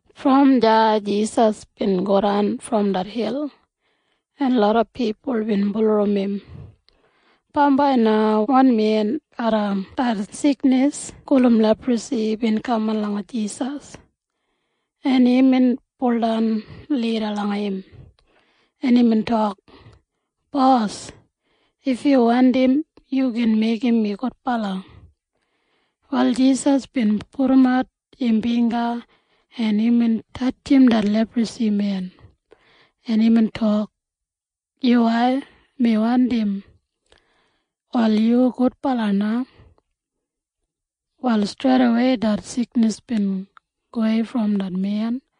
Brom deya Jisas bin godan brom det hil, en loda pipul bin bulurrumbat im. Bambai na wan men garram det siknis gulum leprasi bin kaman langa Jisas, en imbin baudan lida langa im, en imbin tok, “Bos, if yu wandim, yu gin meigim mi gudbala.” Wal Jisas bin pudumat im bingga, en imbin tatjim det leprasimen, en imbin tok, “Yuwai. Mi wandim. Wal yu gudbala na.” Wal streidawei det siknis bin gowei brom det men,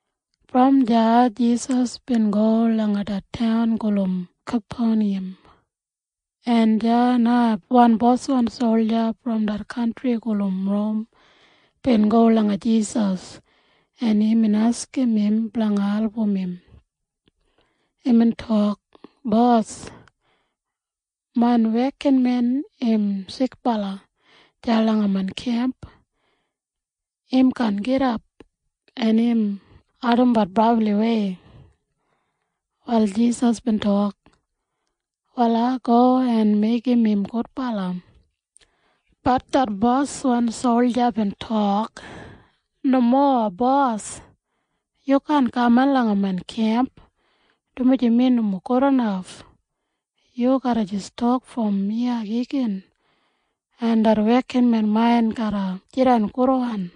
Brom deya Jisas bin go langa det taun gulum Kapeniyam, en deya na wan Roman boswan solja bin go langa Jisas, en imbin askim im blanga album im. Imbin tok, “Bos, main wekinmen im sikbala deya langa main kemp. Im kaan gidap, en im ardimbat brabliwei.” Wal Jisas bin tok, “Wal ai go en meigim im gudbala.” Bat det boswan solja bin tok, “Nomo, Bos. Yu kaan kaman langa main kemp, dumaji mi nomo gudinaf. Yu garra jis tok brom iya igin, en det wekinmen main garra jidan gudwan.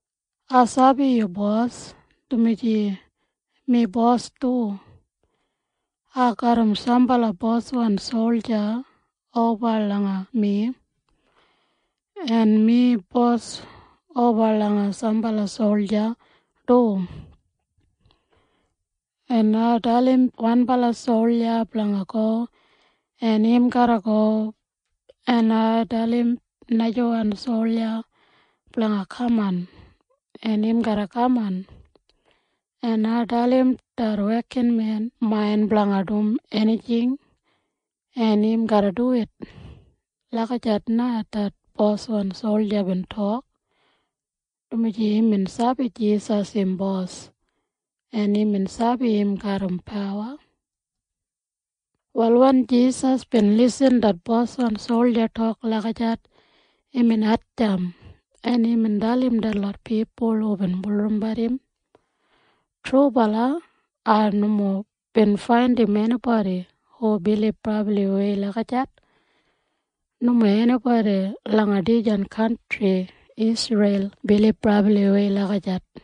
Ai sabi yu bos, dumaji mi bos du. Ai garram sambala boswan solja oba langa mi, en mi bos oba langa sambala solja du. En ai dalim wanbala solja blanga go, en im garra go, en ai dalim najawan solja blanga kaman, en im garra kaman, en ai dalim det wekinmen main blanga dum enijing, en im garra duwit.” Lagijat na det boswan solja bin tok, dumaji imbin sabi Jisas im Bos, en imbin sabi im garram pawa. Wal wen Jisas bin lisin det boswan solja tok lagijat imbin hatjamp, en imbin dalim detlot pipul hubin bulurrumbat im, “Trubala ai nomo bin faindim enibodi hu bilib brabliwei lagijat. Nomo enibodi langa dijan kantri Isreil bilib brabliwei lagijat.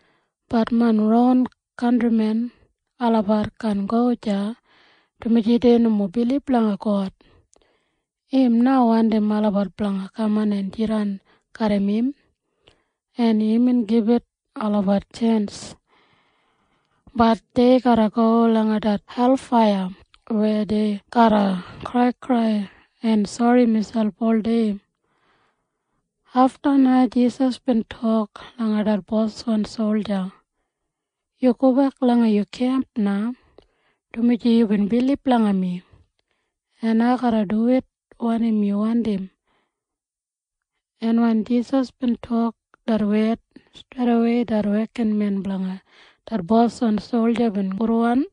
Bat main ron kantrimen olabat kaan go deya, dumaji dei nomo bilib langa God. Im na wandim olabat blanga kaman en jidan garram im, en imbin gibit olabat tjens. Bat dei garra go langa det helfaiya weya dei garra kraikrai en sori miselp oldei.” Afta na Jisas bin tok langa det boswan solja, “Yu gobek langa yu kemp na, dumaji yubin bilib langa mi, en ai garra duwit wanim yu wandim.” En wen Jisas bin tok det wed, streidawei det wekinmen blanga det boswan solja bin gudwan.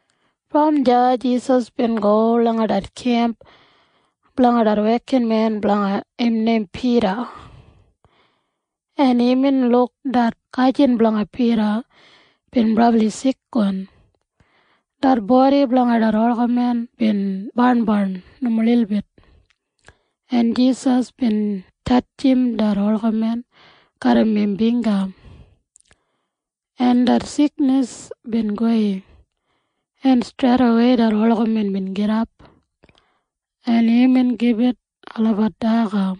Brom deya Jisas bin go langa det kemp blanga det wekinmen blanga im neim Pida, en imbin luk det gajin blanga Pida bin brabli sikwan. Det bodi blanga det olgamen bin barnbarn nomo lilbit, en Jisas bin tatjim det olgamen garram im bingga, en det siknis bin gowei, en streidawei det olgamen bin gidap, en imbin gibit olabat daga.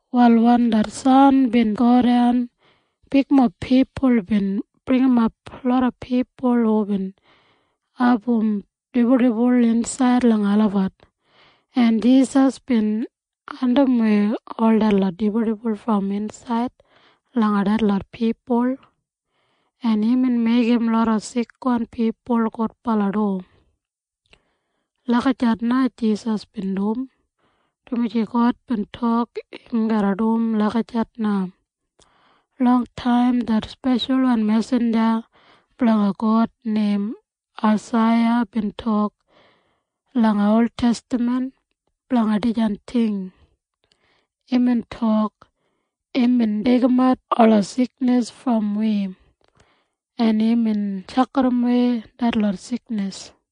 Wal wen det san bin godan, bigmob pipul bin bringimap loda pipul hubin abum dibuldibul insaid langa olabat, en Jisas bin andimwei ol detlot dibuldibul brom insaid langa detlot pipul, en imbin meigim loda sikwan pipul gudbala du. Lagijat na Jisas bin dum, dumaji God bin tok im garra dum lagijat na. Longtaim det speshalwan mesinja blanga God neim Aisaiya bin tok langa oltestaman blanga dijan ting. Imbin tok, “Imbin deigimat ola siknis brom wi, en imbin tjakidawei detlot siknis.”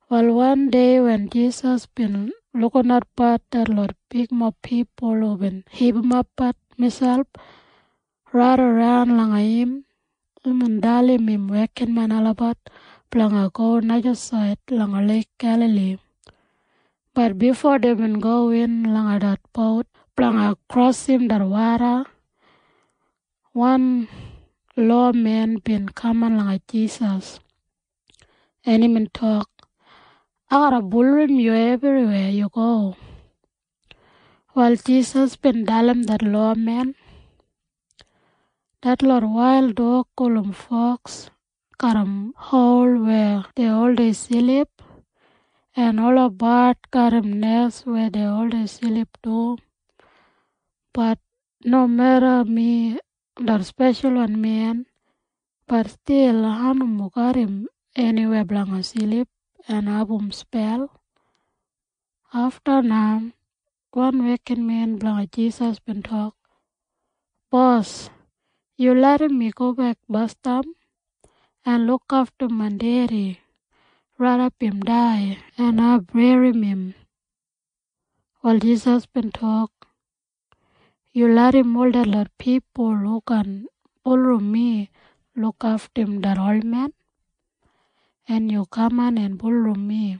Wal wandei wen Jisas bin lukinatbat detlot bigmob pipul hubin hipimapbat miselp raidaran langa im, imbin dalim im wekinmen olabat blanga go najasaid langa Leik Gelali. Bat bifo deibin gowin langa det bout blanga krosim det woda, wan lowamen bin kaman langa Jisas, en imbin tok, “Ai garra bulurrum yu ebriweya yu go.” Wal Jisas bin dalim det lowamen, “Detlot wail dog gulum foks garram hol weya dei oldei silip, en ola bard garram olabat nes weya dei oldei silip du. Bat nomeda mi det Speshalwan Men, bat stil ai nomo garram eniweya blanga silip en abum spel.” Afta na wan wekinmen blanga Jisas bin tok, “Bos, yu larram mi gobek basdam en lukaftum main dedi raidap im dai en ai berrim im.” Wal Jisas bin tok, “Yu larram ol detlot pipul hu kaan bulurrum mi lukaftumbat det olmen, en yu kaman en bulurrum mi.”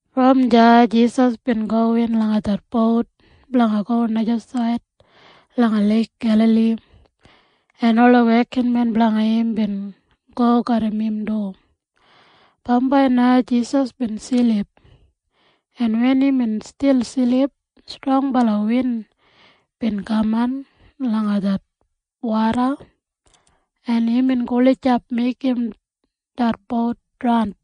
Brom deya Jisas bin gowin langa det bout blanga go najasaid langa Leik Gelali, en ola wekinmen blanga im bin go garram im du. Bambai na Jisas bin silip, en wen imbin stil silip, strongbala win bin kaman langa det woda, en imbin gulijap meigim det bout draun,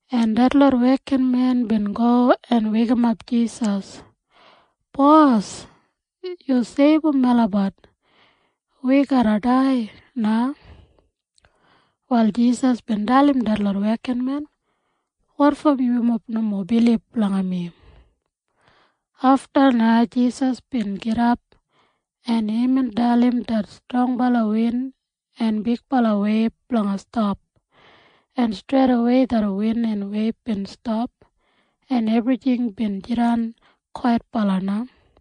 en detlot wekinmen bin go en weikimap Jisas, “Bos! Yu seibum melabat! Wi garra dai na!” Wal Jisas bin dalim detlot wekinmen, “Wotfo yumob nomo bilib langa mi?” Afta na Jisas bin gidap, en imbin dalim det strongbala win en bigbala weib blanga stap, en streidawei det win en weib bin stap, en ebrijing bin jidan kwaitbala na.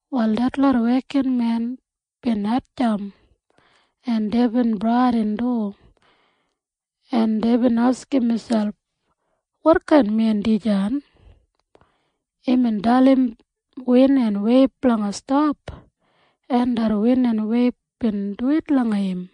Wal detlot wekinmen bin hatjamp, en deibin bradin du, en deibin askim miselp, “Wotkain men dijan? Imbin dalim win en weib blanga stap, en det win en weib bin duwit langa im!”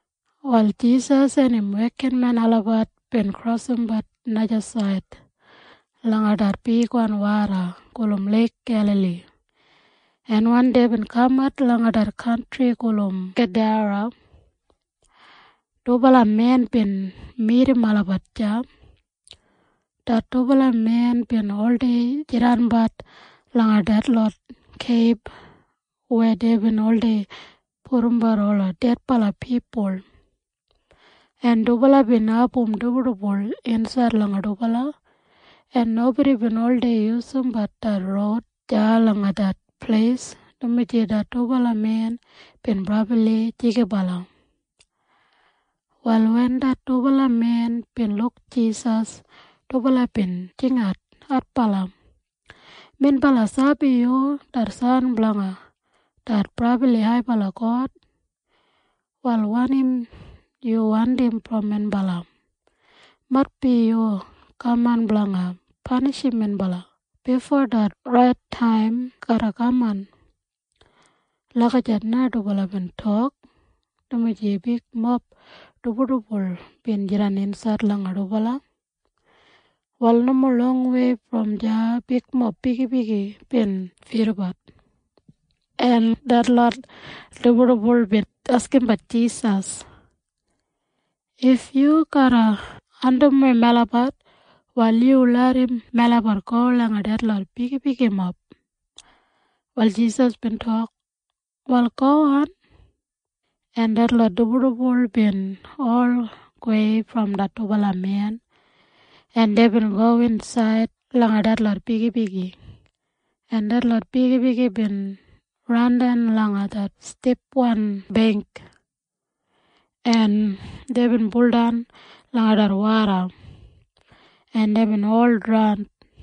Wal Jisas en im wekinmen olabat bin krosim najasaid langa det bigwan woda gulum Leik Gelali, en wen deibin kamat langa det kantri gulum Gedara, dubala men bin midim olabat deya. Det dubala men bin oldei jidanbat langa detlot keib weya deibin oldei pudumbat ola dedbala pipul, en dubala bin abum dibuldibul insaid langa dubala, en nobodi bin oldei yusumbat det roud deya langa det pleis dumaji det dubala men bin brabli jigibala. Wal wen det dubala men bin luk Jisas, dubala bin jingat adbala, “Minbala sabi yu det San blanga det brabli haibala God. Wal wanim yu wandim brom minbala? Maitbi yubin kaman blanga panishim minbala bifo det rait taim garra kaman.” Lagijat na dubala bin tok, dumaji bigmob dibuldibul bin jidan insaid langa dubala. Wal nomo longwei brom deya bigmob bigibigi bin fidabat, en detlot dibuldibul bin askimbat Jisas, “If yu garra andimwei melabat, wal yu larram melabat go langa detlot bigibigimob.” Wal Jisas bin tok, “Wal gowan.” En detlot dibuldibul bin ol gowei brom det dubala men, en deibin gowin insaid langa detlot bigibigi, en detlot bigibigi bin randan langa det stipwan beingk, en deibin buldan langa det woda, en deibin ol draun.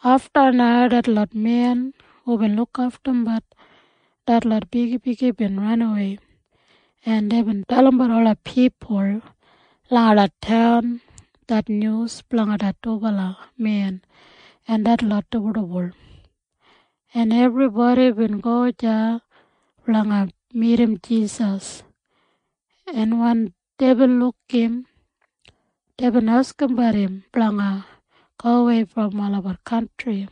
Afta na detlot men hubin lukaftumbat detlot bigibigi bin ranawei, en deibin dalimbat ola pipul langa det taun det nyus blanga det dubala men en detlot dibuldibul, en ebribodi bin go deya blanga midim Jisas, en wen deibin luk im, deibin askimbat im blanga gowei brom olabat kantri.